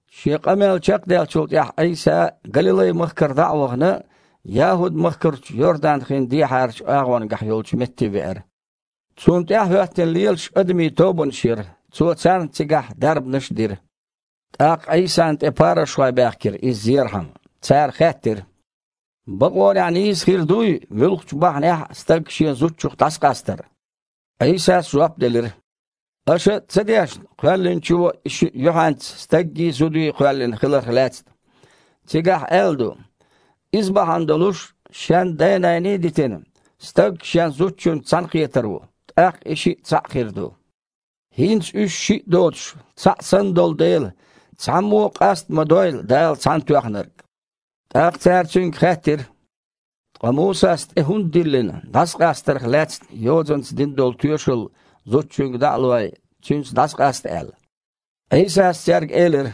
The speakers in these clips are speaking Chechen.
Шен къамел чекхдаьллачул тІаьхьа Іийса, Галилай-махкара дІа а вахана, ЯхІуд-махкарчу Йордан-хина дехьарачу агІонгахь йолчу метте веара. Цунна тІаьхьа хІоьттина лелаш адамийн тобанаш яра, Цо царна цигахь дарбанаш а дира. ТІаккха Іийсана тІе парушхой баьхкира, Иза зерхьама. Цара хаьттира: «Бакъонехь нийса хир дуй муьлххачу бахьанехь а стаг шен зудчух дІасакъастар?» Іийсас жоп делира: «Аша ца дешна Кхоьллинчо и шиъ юьхьанца стаггий, зудий кхоьллина хиларх лаьцна? Цигахь аьлла ду: „Иза бахьана долуш, шен дай-наний а дитина, стаг шен зудчуьнца цхьаьнакхетар ву. ТІаккха и шиъ цхьаъ хир ду“. ХІинца уьш шиъ доцуш, цхьаъ санна долу дела, цхьаммо а къаста ма дойла Дала цхьаьнатоьхнарг!» ТІаккха цара Цуьнга хаьттира: «Ткъа Мусас тІе хІунда диллина, дІасакъастарх лаьцна йозанца дина долу тоьшалла зудчуьнга дІа а лой, цуьнца дІасакъаста аьлла?» Іийсас цаьрга элира: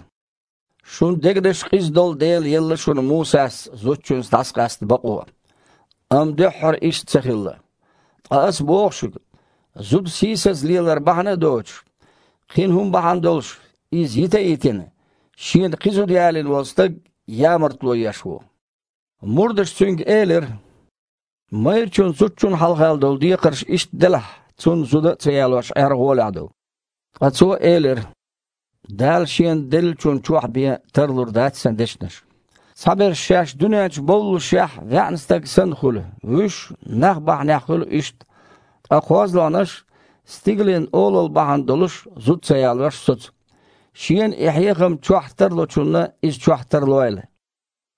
«Шун дегнаш къиза долу дела елла шуна Мусас зудчуьнца дІасакъаста бакъо. Амма дуьххьара иштта ца хилла. Ткъа Аса боху шуьга: зуда сийсаза лелар бахьана а доцуш, кхин хІума бахьана долуш иза йита а йитина, шена кхин зуда ялийна волу стаг, ямартло еш ву». Мурдаша Цуьнга элира: «Майрачун зудчунна хьалха долу декхарш иштта делахь, цунна зуда а ца ялош Іер гІолехь ду». Ткъа Цо элира: «Дала шена деллачунна чохь бен тарлур дац Сан дешнаш. Цхьаберш шаьш дуьнен чу бовллушехь ваьІна стаг санна хуьлу, вуьш – нах бахьанехь хуьлу иштта, ткъа кхозлагІнаш Стигалийн Олалла бахьана долуш зуда ца ялош соцу. Шена и хьехам чохь тарлочунна иза чохь тарлойла».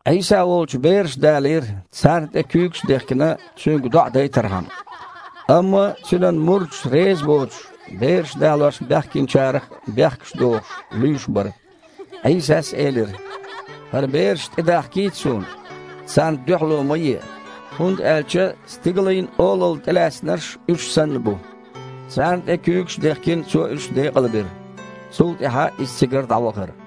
Іийса волчу бераш далийра, царна тІе куьйгаш а дехкина, Цуьнга доІа дайтархьама. Амма Цуьнан мурдаш резабоцуш, бераш далош баьхкинчарах бехкаш дохуш, луьйш бара. Іийсас элира: «ХІара бераш тІедахкийта Суна, царна дуьхьало ма е, хІунда аьлча Стигалийн Олалла тІелаьцнарш уьш санна бу». Царна тІе куьйгаш а дехкина, Цо уьш декъалбира. Цул тІаьхьа Иза цигара дІавахара.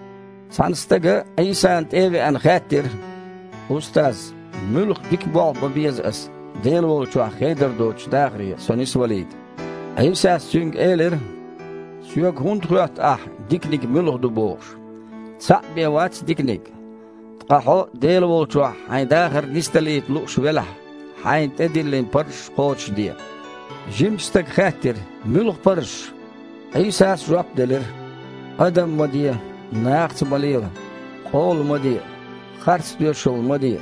Цхьана стага, Іийсана тІе а веана, хаьттира: «Устаз, муьлха дика болх бан беза аса Дела волчохь хедар доцучу дахаре со нисвалийта?» Іийсас цуьнга элира: «Соьга хІунда хоьтту ахьа, диканиг муьлха ду бохуш. Цхьаъ бен вац Диканиг. Ткъа хьо Дела волчохь хьайн дахар нисдалийта лууш велахь, хьайна тІедиллина парзаш кхочушде». Жимачу стага хаьттира: «Муьлха парзаш?» Іийсас жоп делира: «Адам ма де, нахаца ма лела, къола ма де, харц тоьшалла ма де,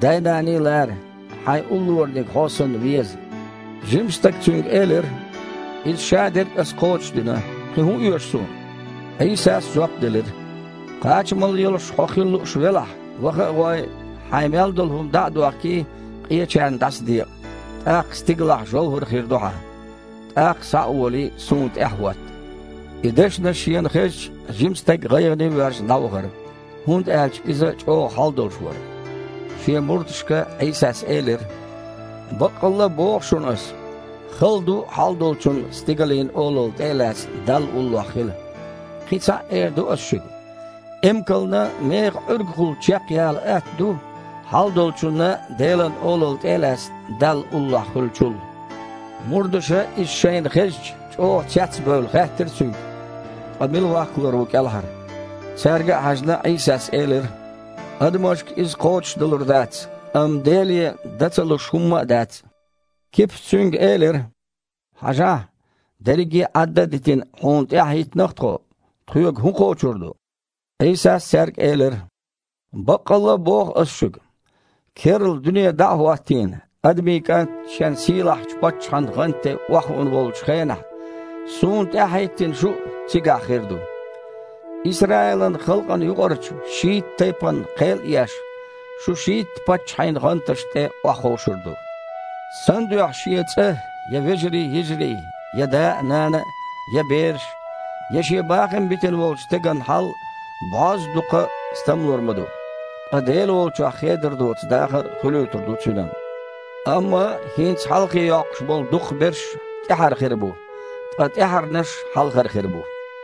дай-наний а лара, хьайн уллораниг хьо санна веза». Жимачу стага Цуьнга элира: «Иза шадерг а аса кхочушдина, кхин хІун оьшу суна?» Іийсас жоп делира: «Кхачамалла йолуш хьо хила лууш велахь, ваха а гІой, хьайн мел долу хІума дІа а дохкий, къечарна дІасадекъа, тІаккха стигалахь жовхІар хир ду хьан. ТІаккха, схьа а волий, Суна тІаьхьахІотта». И дешнаш шена хезча, жима стаг, гІайгІане а воьжна, дІавахара, хІунда аьлча иза чІогІа хьал долуш вара. Шен мурдашка Іийсас элира: «Баккъалла а боху шуна Аса: хала ду хьалдолчунна, Стигалийн Олалла тІе а лаьцна, Далла уллохь хила. Кхин цхьаъ а эр ду Аса шуьга: эмкална механ Іуьргахула чекхъяла атта ду, хьалдолчунна, Делан Олалла тІе а лаьцна, Далла уллохь хуьлучул». Мурдаша, иза шайна хезча, чІогІа цец а бевлла, хаьттира Цуьнга: «Ткъа мила ваккхалур ву кІелхьара?» Цаьрга а хьаьжна, Іийсас элира: «Адамашка иза кхочушдалур дац, амма Деле дан а ца луш хІумма а дац». Кипас Цуьнга элира: «Хьажахьа! Дерриге Іадда а дитина, Хьуна тІаьхьа хІиттина-кх тхо. Тхоьга хІун кхочур ду?» Іийсас цаьрга элира: «Баккъалла а боху Аса шуьга: керла дуьне дІа а хІоттийна, Адамийн КІант Шен сийлахьчу паччахьан гІанта тІе охьахуун волчу хенахь, Суна тІаьхьахІиттина шу а цигахь хир ду. Исраилан халкъана юкъарчу шийтта тайпанна кхел а еш, шу шийтта паччахьийн гІанташна тІе охьаховшур ду. Сан дуьхьа шен цІа, я вежарий-йижарий, я да а, нана а, я бераш, я шен бахам битина волчу стеган хьал бІозза дукха стамлур ма ду, ткъа Дела волчохь хедар доцу дахар а хуьлуьйтур ду цуьнан. Амма хІинца хьалхе йоккхуш болу дукхахберш тІаьхьара хир бу, ткъа тІаьхьарнаш хьалхара хир бу».